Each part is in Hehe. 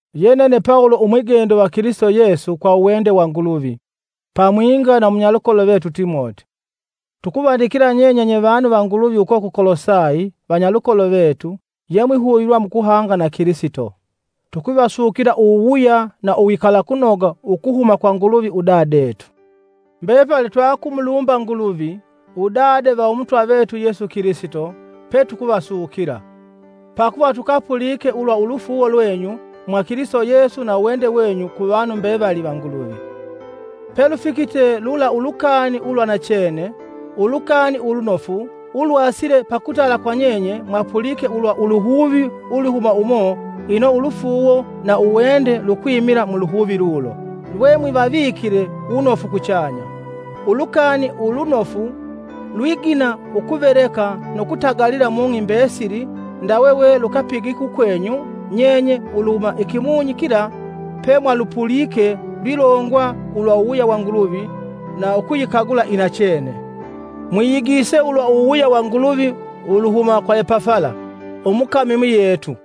Ye nene Pawulo umwigendo va Kilisito Yesu kwa uwende wa Nguluvi, pamwinga na umunyalukolo vetu Timoti, tukuvandikila nyenye nyevanu va Nguluvi uko ku Kolosayi vanyalukolo vetu yemwihuvilwa mukuhanga na Kilisito. Tukuvasukila uwuwuya na uwikalakunoga ukuhuma kwa Nguluvi udadetu. Mbepali twatukumulumba Nguluvi, Udade va Umutwa vetu Yesu Kilisito, petukuvasukila. Pakuva tukapulike ulwa ulufuuwo lwenyu mwa Kilisito Yesu na uwende wenyu kuvanu mbevali va Nguluvi. Pelufikite lula ulukani ulwa nachene, Ulukani Ulunofu ulwasile pakutala kwa nyenye mwapulike ulwa uluhuvi ulwihuma umo ino ulufuuwo na uwende lukwimila mu luhuvi lulo, lwemwivavikile wunofu kuchanya. Ulukani Ulunofu lwigina ukuveleka nu kutagalila mung'i mbesili ndawe we lukapigite ukwenyu nyenye uluhuma ikimunyi kila pemwalupulike lwilongwa ulwa uwuwuya wa Nguluvi na ukuyikagula inachene. Mwiyigiise ulwa uwuwuya wa Nguluvi uluhuma kwa Epafala, umukami muyetu,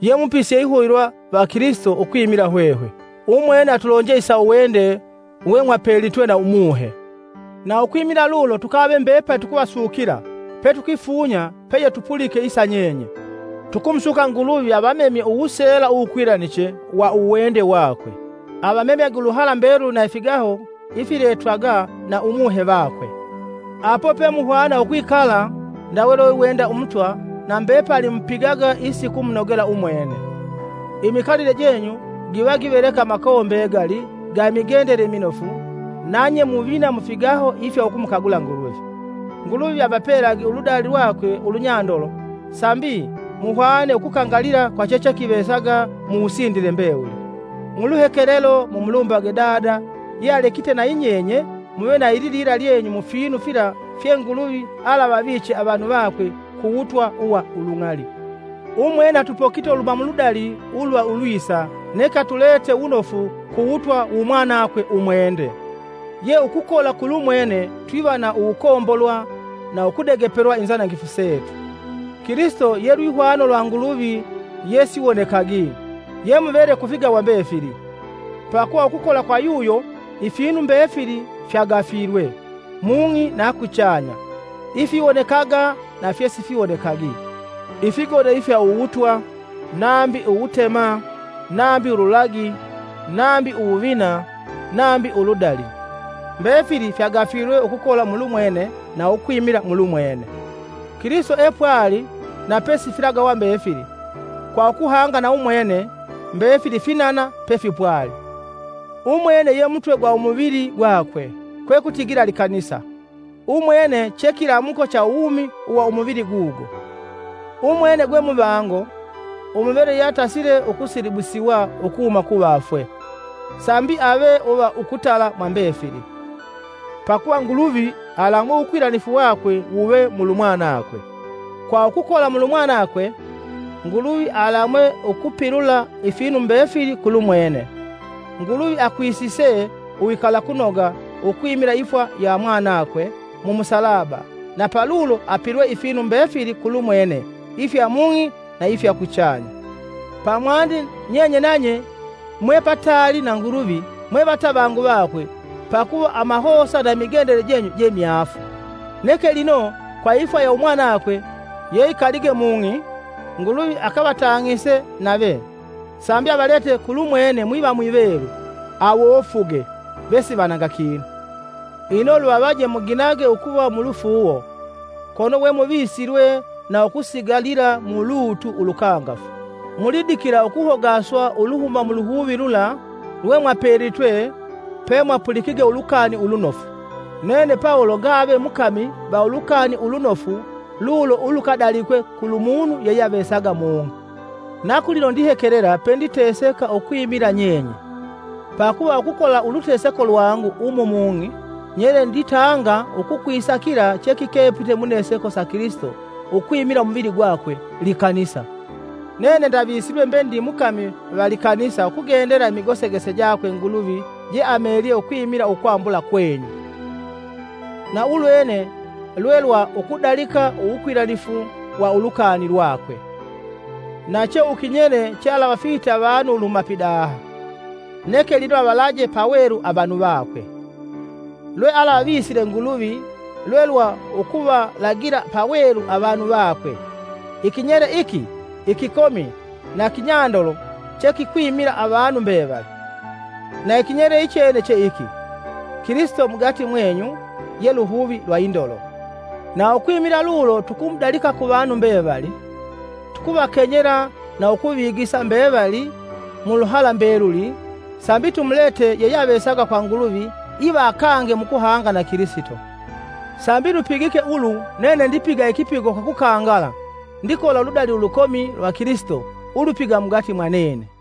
ye mupisi yeihuvilwa va Kilisito ukwimila hwehwe. Umwene atulonje isa uwende wemwapelitwe na Umuhe. Na ukwimila lulo tukave mbepali tukuvasukila petukwifunya peyetupulike isa nyenye. Tukumusuka Nguluvi avamemye uwuseela uwukwilaniche wa uwende wakwe, avamemyage uluhala mbeluli na ifigaho ifiletwaga uwiletwagwa na Umuhe vakwe. Apo pemuhwana ukwikala ndawe lweiwenda Umutwa na mbepali mupigaga isikumunogela umwene. Imikalile jenyu giva giveleka amakowo mbegali ga imigendele iminofu nanye muvina mufigaho ifya ukumukagula Nguluvi. Nguluvi avapelage uludali lwakwe ulunyandolo sambi, muhwane ukukangalila kwa chechekivesaga muwusindile mbewuli. Muluhekelelo mumulumbage Dada yealekite nayi nyenye muve na ililila lyenyu mufinu fila fye Nguluvi alavaviche avanu vakwe kuwutwa uwa ulung'ali. Umwene atupokite uluhuma muludali ulwa ulwisa neke atulete wunofu kuwutwa wumwanakwe umwende, ye ukukola kulumwene twiva na uwukombolwa na ukudegepelwa inzanangifu setu. Kilisito ye lwihwano lwa Nguluvi yesiwonekagi. Ye Muvele kufigawa mbefili. Pakuva ukukola kwa yuyo ifinu mbefili fyagafilwe, mung'i na kuchanya, ifiwonekaga na fyesifiwonekagi; ifigoda ifya uwutwa, apangi uwubana malungulu, apangi uludali lwa amasoka, apangi indagi. Mbefili fyagafilwe ukukola mulumwene na ukwimila mulumwene. Kilisito epwali na pesifilagawa mbefili, kwa ukuhanga na umwene, mbefili finana pefipwali. Umwene ye mutwe gwa umuvili gwakwe, kwekutigila likanisa, umwene che kilamuko cha uwumi uwa umuvili gugo. Umwene gwe muvango, umuvele yatasile ukusilibusiwa ukuhuma kuvafwe, sambi ave uva ukutala mwambefili. Pakuva Nguluvi alamwe uwukwilanifu wakwe wave mulumwanakwe. Kwa ukukola mulumwanakwe, Nguluvi alamwe ukupilula ifinu mbefili kulumwene, Nguluvi akwisise uwikalakunoga ukwimila ifwa ya mwanakwe mu musalaba na palulo apilwe ifinu mbefili kulumwene ifya mung'i na ifya kuchanya. Pamwandi nyenye nanye mwepataali na Nguluvi mwe vatavangu vakwe pakuva amahosa na imigendele jenyu je myaafu. Neke lino kwa ifwa ya umwanakwe yeikalige mung'i Nguluvi akavatang'ise nave, sambi avalete kulumwene mwiva mwivelu, awofuge, vesivananga kinu. Ino luvavaje muginage ukuva mulufuuwo kono wemuvisilwe na ukusigalila mulutu ulukangafu, mulidikila ukuhogaswa uluhuma muluhuvi lula lwemwapelitwe pemwapulikige Ulukani Ulunofu. Nene Pawulo ngave mukami va Ulukani Ulunofu lulo ulukadalikwe kulu munu yeyeavesaga mung'i. Ikipigo cha Pawulo mu makanisa. Na kulino ndihekelela penditeseka ukwimila nyenye, pakuva ukukola uluteseko lwangu umu mung'i, nyele nditanga ukukwisa kila chekikepa muneseko sa Kilisito ukwimila umuvili gwakwe, likanisa. Nene ndavisilwe mbe ndi mukami va likanisa ukugendela imigosekese jakwe Nguluvi jeameelye ukwimila ukwambula kwenyu. Na ulwene lwelwa ukudalika uwukwilanifu wa ulukani lwakwe, na che uwukinyele chealavafihite avanu uluhuma pidaha, neke lino avalaje pawelu avanu vakwe. Lwealavisile Nguluvi lwelwa ukuvalagila pawelu avanu vakwe, ikinyele iki ikikomi na kinyandolo che kikwimila avanu mbevali. Na ikinyele ichene che iki. Kilisito mugati mwenyu, ye luhuvi lwa indolo. Na ukwimila lulo tukumudalika ku vanu mbevali; tukuvakenyela na ukuvigisa mbevali muluhala mbeluli, sambi tumulete yeyeavesaga kwa Nguluvi iva akange mukuhanga na Kilisito. Sambi lupigike ulu nene ndipiga ikipigo kwa kukangala ndikola uludali ulukomi lwa Kilisito ulwipiga mugati mwanene.